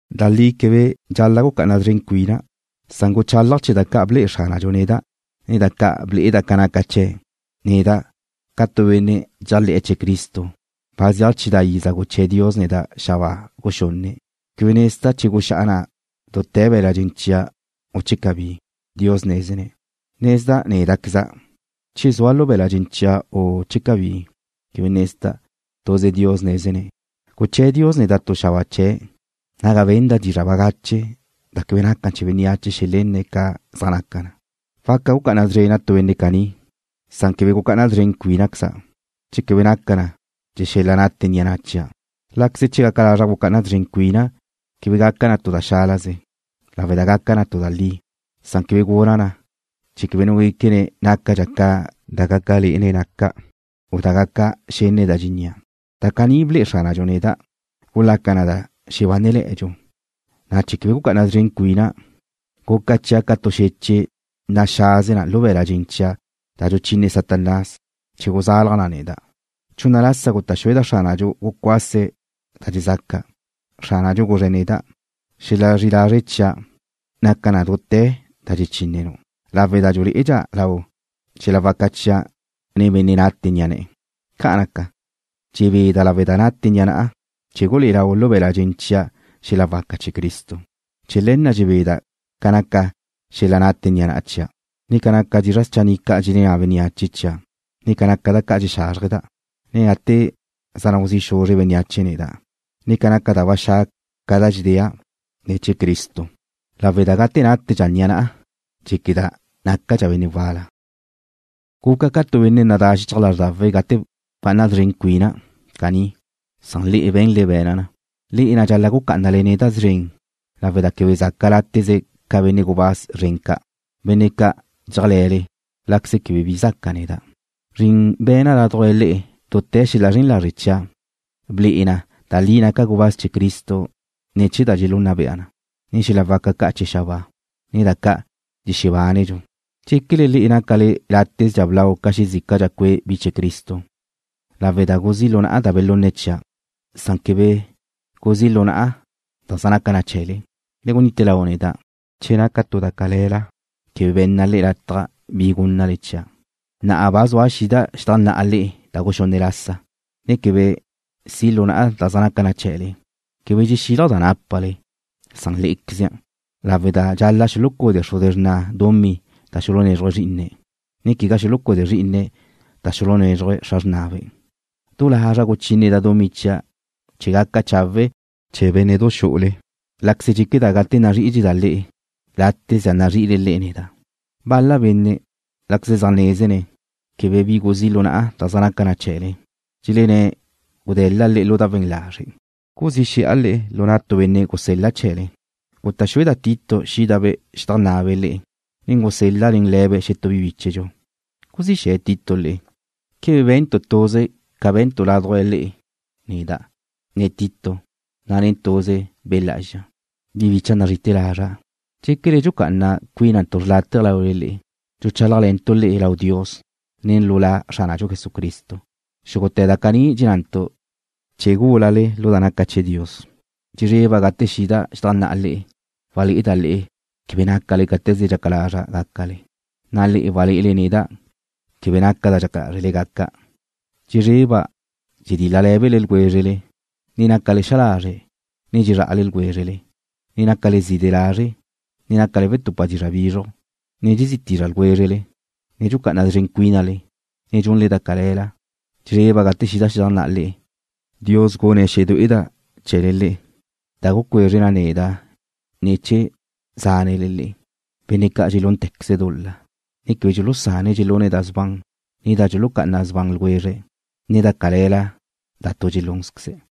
Da li quebe dxal-la' gucá'ana szren cuina', san guchálaja' chee̱ da ca' ble'e Xránadxu neda', ne da ca' ble'eda' ca naca chee̱'. Neda', ca tu benne' dxéajle̱ chee̱ Cristo, ba zeaj chidá' iza guché̱ Dios neda' xabáa guxunne'. Quebe nezda' che guxá'a na' dute̱ be̱la' dxen chia', u che cabí. Dios nézene̱'. Nezda' néda'queza', che zua' lu be̱la' dxen chia', u che cabí, quebe nezda', tuze Dios nézene̱'. Guché̱ Dios neda' tu xabáa chee̱', naga benda' dizra' bagache da quebe naca chee̱ bénneache xelenné̱' ca zaj naca na. Waca gucá'ana szrena' tu benne' caní, san quebe gucá'ana szren cuínaqueza', che quebe naca na chee̱ xel-la nate ni'a na' chia'. Láqueze che gaca lazra' gucá'ana szren cuina' quebe gaca na tu da xálaze, lawe' da gaca na tu da li. Quebe guna' na chee̱ quebe nu guéquene̱' nácadxa' ca da gaca lé'ene̱' naca', u ca da gaca xenne̱' da dxennía'. Da caní ble'e Xránadxu neda' gulaca na da xebánele̱'e̱dxu, na' chee̱ quebe gucá'ana szren cuina', guca chia' ca tu xeche' naxaze lu be̱la' dxen chia' da dxuchine Satanás chee̱ guzalaj na neda'. Chunna lasa guta' xueda' Xránadxu gucuase̱' da dxezaca'. Xránadxu guzre̱' neda': “Xela zri'i lazre' chia' naca na dute̱ da dxechínenu' lawe' da dxulé'edxa lau xel-la waca chia' nen benne' nate ni'a ne̱'e̱.” Ca' naca, dxebeda' lawe' da nate ni'a na'a chee̱ gulé'e lau lu be̱la' dxen chia' xel-la waca chee̱ Cristo. Chee̱ le̱ na' dxebeda' ca naca xel-la nate ni'a na' chia', ne ca naca dizra' schanni' ca' dxelenná bénneache chia', ne ca naca da ca' dxexázrjeda', ne gate zaj nau zi' xuzre' bénneache neda', ne ca naca da ba xa' ca' da dxedéa' ne̱ chee̱ Cristo, lawe' da gate nátedxa ni'a na'a, dxéqueda' nácadxa' benne' wal-la. Guca' ca tu benne' nadá xichaj lázrdawe' gate bca'ana szren cuina' caní, san le'e be̱nle be̱na' na. Le'e na' dxal-la' gucá'anale neda' szren lawe' da quebe zaca' látezdxa ca benne' gubáz zren ca', benne' ca' dxéajle̱le, láqueze quebe bi zaca' neda'. Zrin be̱na' ládujla le'e lu dute̱ xel-la zren lazre' chia' ble'e na da li naca' gubáz chee̱ Cristo ne̱ chee̱ da dxelunna bea na, ne xel-la waca ca' chee̱ xabáa, ne da ca' dxexebánedxu. ¿Dxéquele le'e nácale látezdxa blau ca xezícadxa cue' bi chee̱ Cristo lawe' da guzí' lu na'a da belunne̱' chia', na' quebe guzí' lu na'a da zaj naca chee̱le? Le gunite lau neda' che naca tu da cale̱la quebe be̱nna' le'e lataj bi gúnnale chia'. Na'a ba zua' xida' xedajnná'a le'e da guxunne' lasa, ne quebe si' lu na'a da zaj naca na chee̱le. Quebe dxexílaja' da nápale, san lé'equeze, lawe' da dxal-la' xulucude xruze xrna' dumí da xulunézruje̱' zrí'ine̱', ne quegá xulucude zrí'ine̱' da xulunézrujbe' xra xrnabe'. Du lazra' guchíneda' dumí chia' chee̱ gaca chawe' chee̱ bénne'du xu'ule, láqueze dxéqueda' gate nazrí'idxeda' le'e, látezdxa nazri'ile le'e neda'. Bal-la benne', láqueze zaj nézene̱' quebe bi guzí' lu na'a da zaj naca na chee̱le, dxelenné̱' gude̱l-la' le'e lu da we̱n lazre'. ¿Guzí xe̱'a le'e lu na' tu benne' gusel-la' chee̱le? Guta' xueda' Tito xídabe' xedajnná'abe' le'e, ne gusel-la' nen le̱be' xetú bi bíchedxu. ¿Guzí xe̱ Tito le'e? ¿Quebe be̱ntu' tuze ca be̱ntu' ládujla le'e neda', ne Tito, na' nen tuze Be' Lá'azxa? Bi bicha' nazri'ite̱ lazra', ¿dxéquele dxucá'ana cuínantu' xrlátaje laule le'e? Dxuchálajle̱ntu' le'e lau Dios, ne lu La Xránadxu Jesucristo. Xúgute̱ da caní dxennantu' chee̱ gúlale lu da naca chee̱ Dios. Dxezreba' gate xida' xedajnná'a le'e, walé'eda' le'e quebe nácale cáte̱ze dxaca lazra' gácale, na' le'e walé'ele neda' quebe naca' da dxaca lázrele gaca'. Dxezreba' dxedíl-lale̱le ljwézrele, ne nácale xa lazre', ne dxezrá'ale ljwézrele, ne nácale zide lazre', ne nácale wetupa dizra' bizruj, ne dxezí tízrale ljwézrele, ne dxucá'ana szren cuínale, ne dxunle da cale̱la. Dxezreba' gate xida' xedajnná'a le'e, Dios gune̱' xedué'eda' ne̱ chee̱le le'e, da gucuezre na neda' ne̱ chee̱ zánele le'e, benne' ca' dxelúntequeze̱' dul-la, ne quebe dxulusane̱' dxelune̱' da sban, ne da dxulucá'ana sban ljwezre̱', ne da cale̱la da tu dxelúnzqueze̱'.